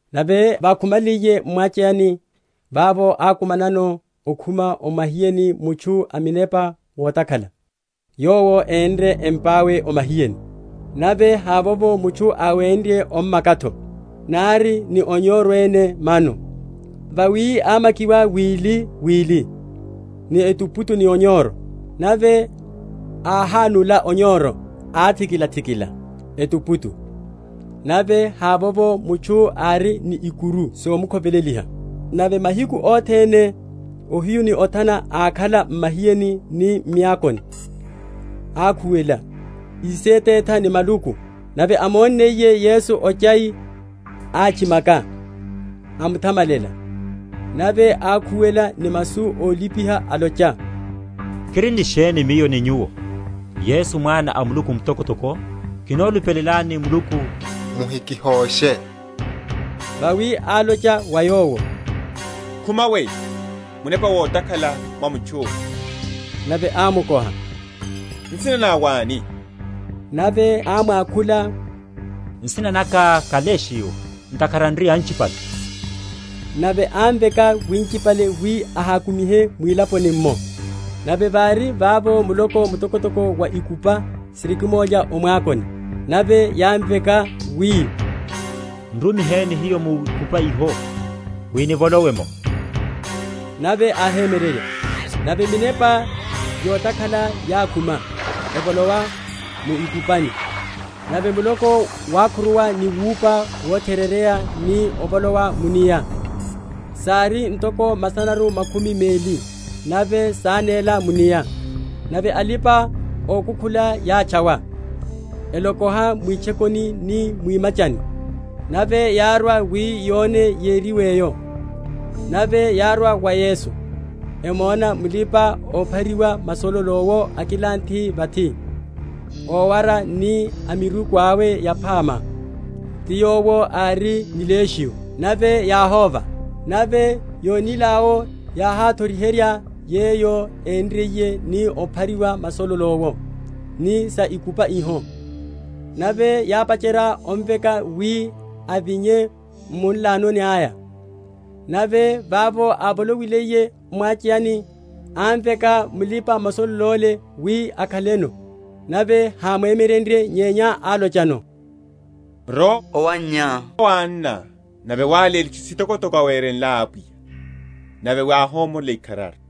Nave vákhumaliye m’mwacheyani, vavo ákumanano ókhuma o mahiyeni mutchu a munepa wotakhala, yowo énre empa’we o mahiyeni; nave havovo mutchu áwenrye ommaka’tho, nari ni onyoro ene mano; vawi ámakiwa wiliwili ni etuputu ni onyoro, nave áhánula onyoro, áthikila‐thikila etuputu; nave havovo mutchu ári ni ikuru somukhoveleliha. Nave mahiku othene ohiyu ni othana ákhala m’mahiyeni ni m’miakoni, akhuwela, ísethetha ni maluku. Nave ámonniye Yesu ochai, átchimaka, amuthamalela, nave ákhuwela ni masu ólipiha, alocha, Kiri ni sheni miyo ni Nyuwo, Yesu Mwana a Muluku Mtokotoko? Kinolupelelani Muluku, muhikihoshe. Vawi álocha wa yowo, Khuma weyo, munepa wotakhala mwa mutchu’la. Nave ámukoha, Nsina ná wáni? Nave ámwakhula, Nsina naka ká Legio; ntakhara n’ri anchipale. Nave ámveka winchipale wi áhákumihe mwilaponi’mmo. Nave vári vavo muloko mtokotoko wa ikupa sirikimulya o mwakoni. Nave yámveka wi, N’rumiheni hiyo mu ikupani iho, wi nivolowe’mo. Nave áhemyererya. Nave minepa yotakhala yákhuma, evolowa mu ikupani; nave muloko wákhuruwa ni wupuwa votherereya ni ovolowa mu’nia, (sári ntoko masanaru makhumi meli;) nave sánéla mu’nia. Nave alipa‐okukhula yátchawa, elokoha mwitchokoni ni mwimachani. Nave yárwa wi yone yériwe’yo. Nave yárwa wa Yesu, emona mulipa‐ophariwa masololo’wo akilanthe vathi, ówara ni a miruku awe yaphama, ti yowo ári ni Legio; nave yáhóva. Nave yónil’awo, yáháthoriherya yeyo énriye ni óphariwa masololo’wo, ni sa ikupa iho. Nave yápacherya omveka wi avinye m’munlano aya. Nave vavo ávolowiye m’mwacheyani, ámveka mulipa‐masololo’le wi akhaleno. Nave hámwemyerenrye, nyenya álochano, Rowa owannyá wa anná, nave wáléle itchu sitokotoko áwerenlá Apwiya, nave wi áhomorela ikharari.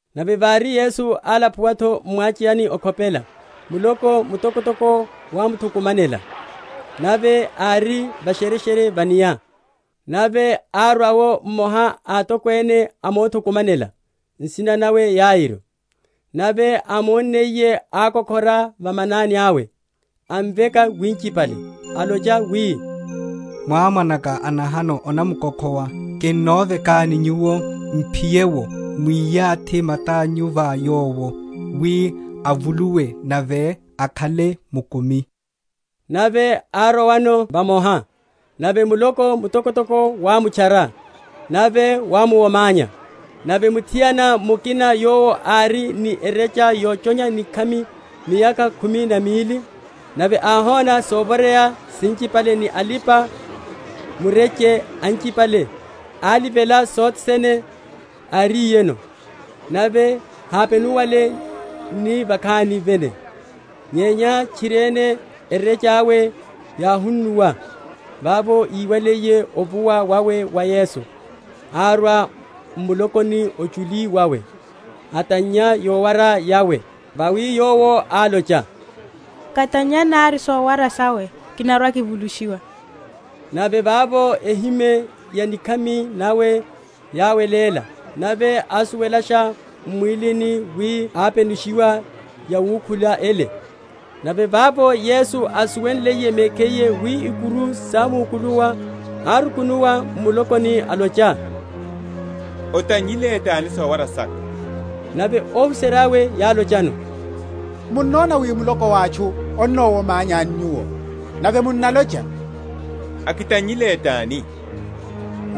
Nave vári Yesu álapuwa’tho m’mwacheyani okhopela, muloko mtokotoko wámuthukumanela; nave ári va’shereshere va’nia. Nave arwa’wo mmoha a atokwene a mothukumanela, nsina nawe Yairo; Nave ámonniye, ákokhora va manani awe, amveka winchipale; alocha wi, Mwá‐mwanaka a nahano anamkokhowa: kinovekani Nyuwo m’phiye’wo, mwiyathi mata’nyu va yowo, wi avuluwe nave akhale mukumi. Nave árowano vamoha; nave muloko mtokotoko wámutchara, nave wámuwomanya. Nave muthiana mukina yowo ári ni erecha yochonya nikhami miyakha khumi na mili, nave áhona sovoreya sinchipale ni alipa‐mureche anchipale, alivela sothene áriyeno, nave hápenuwale ni vakhani vene, nyenya tchiriene erecha’we yáhunnuwa, vavo íwaliye ovuwa wawe wa Yesu, árwa m’mulokoni ochuli wawe, atannya yowara yawe. Vawi yowo álocha, Katannya nari sowara sawe, kinarwa‐kivulushiwa. Nave vavo ehime ya nikhami nawe yáweléla nave ásuwelasha m’mwílini wi ápenushiwa yawukhula ele. Nave vavo Yesu ásuwenliye mekhiye wi ikuru sámukuluwa, árukunuwa m’mulokoni alocha, Atannyile tani sowara saka? Nave óhuserya’we yálochano, Munnona wi muloko wa atchu onamuwomanyani Nyuwo, nave munnalocha, Akitannyile tani?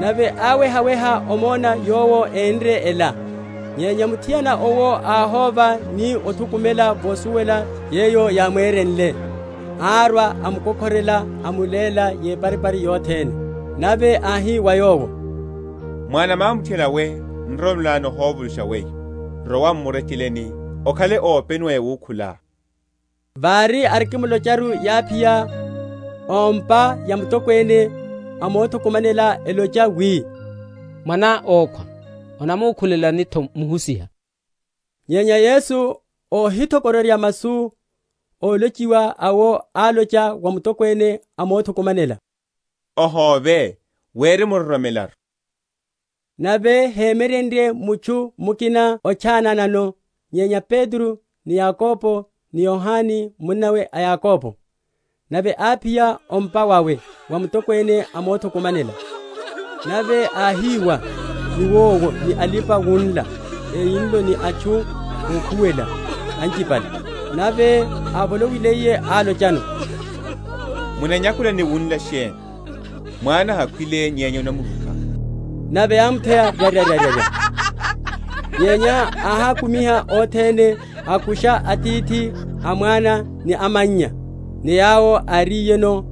Nave áwehaweha omona yowo énre ela. Nyenya muthiana owo áhóva ni othukumela vosuwela yeyo yámwereyenle, arwa, amukokhorela, amuléla yeparipari yothene. Nave áhi wa yowo, Mwana mwa muthiana we nroromelo ná nihovulusha weyo; rowa m’murecheleni, okhale ópenuwa yawukhulá. Vári arikimulocharu, yáphiya ó’mpa ya mutokwene a mothukumanela, elocha wi, Mwaná ókhwa; onamukhulelani’tho Muhusiha? Nyenya Yesu óhithokororya masu ólochiwa awo, álocha wa mutokwene a mothukumanela, Ohóve, wirimuroromelaru. Nave hémyerenrye mutchu mukina otchananano nyenya Petro, ni Yakobo ni Yohane munnawe a Yakobo. Nave áphiya o’mpa wawe wa mutokwene a mothukumanela; nave áhiwa niwowo ni alipa‐wunla eyinlo, ni atchu ókhuwela anchipale. Nave ávolowiliye, álochano, Munanyakula ni wunlela sheni? Mwana hakhwile nyenya anamrupa. Nave yámutheya ryaryarya. Nyenya áhákumiha othene, akusha atithi a mwana, ni amannya, ni yawo áriyeno,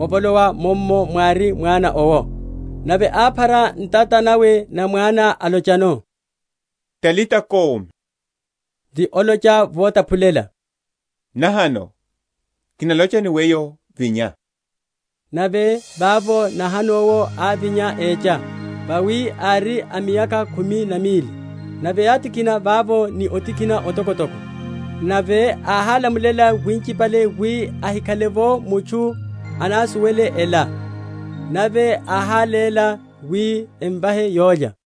avolowa mummo mwári mwana owo. Nave áphara ntata nawe na mwana, alochano, Talita koumi; ti olocha votaphulela, Nahano, kinalocha ni weyo, Vinya. Nave vavo nahano’wo ávinya, écha; vawi ári a miyakha khumi na mili. Nave yátikhina vavo ni otikhina otokotoko. Nave áhálamulela winchipale wi ahikhale’vo mutchu anasuwele ela, nave áháléla wi emvahe olya.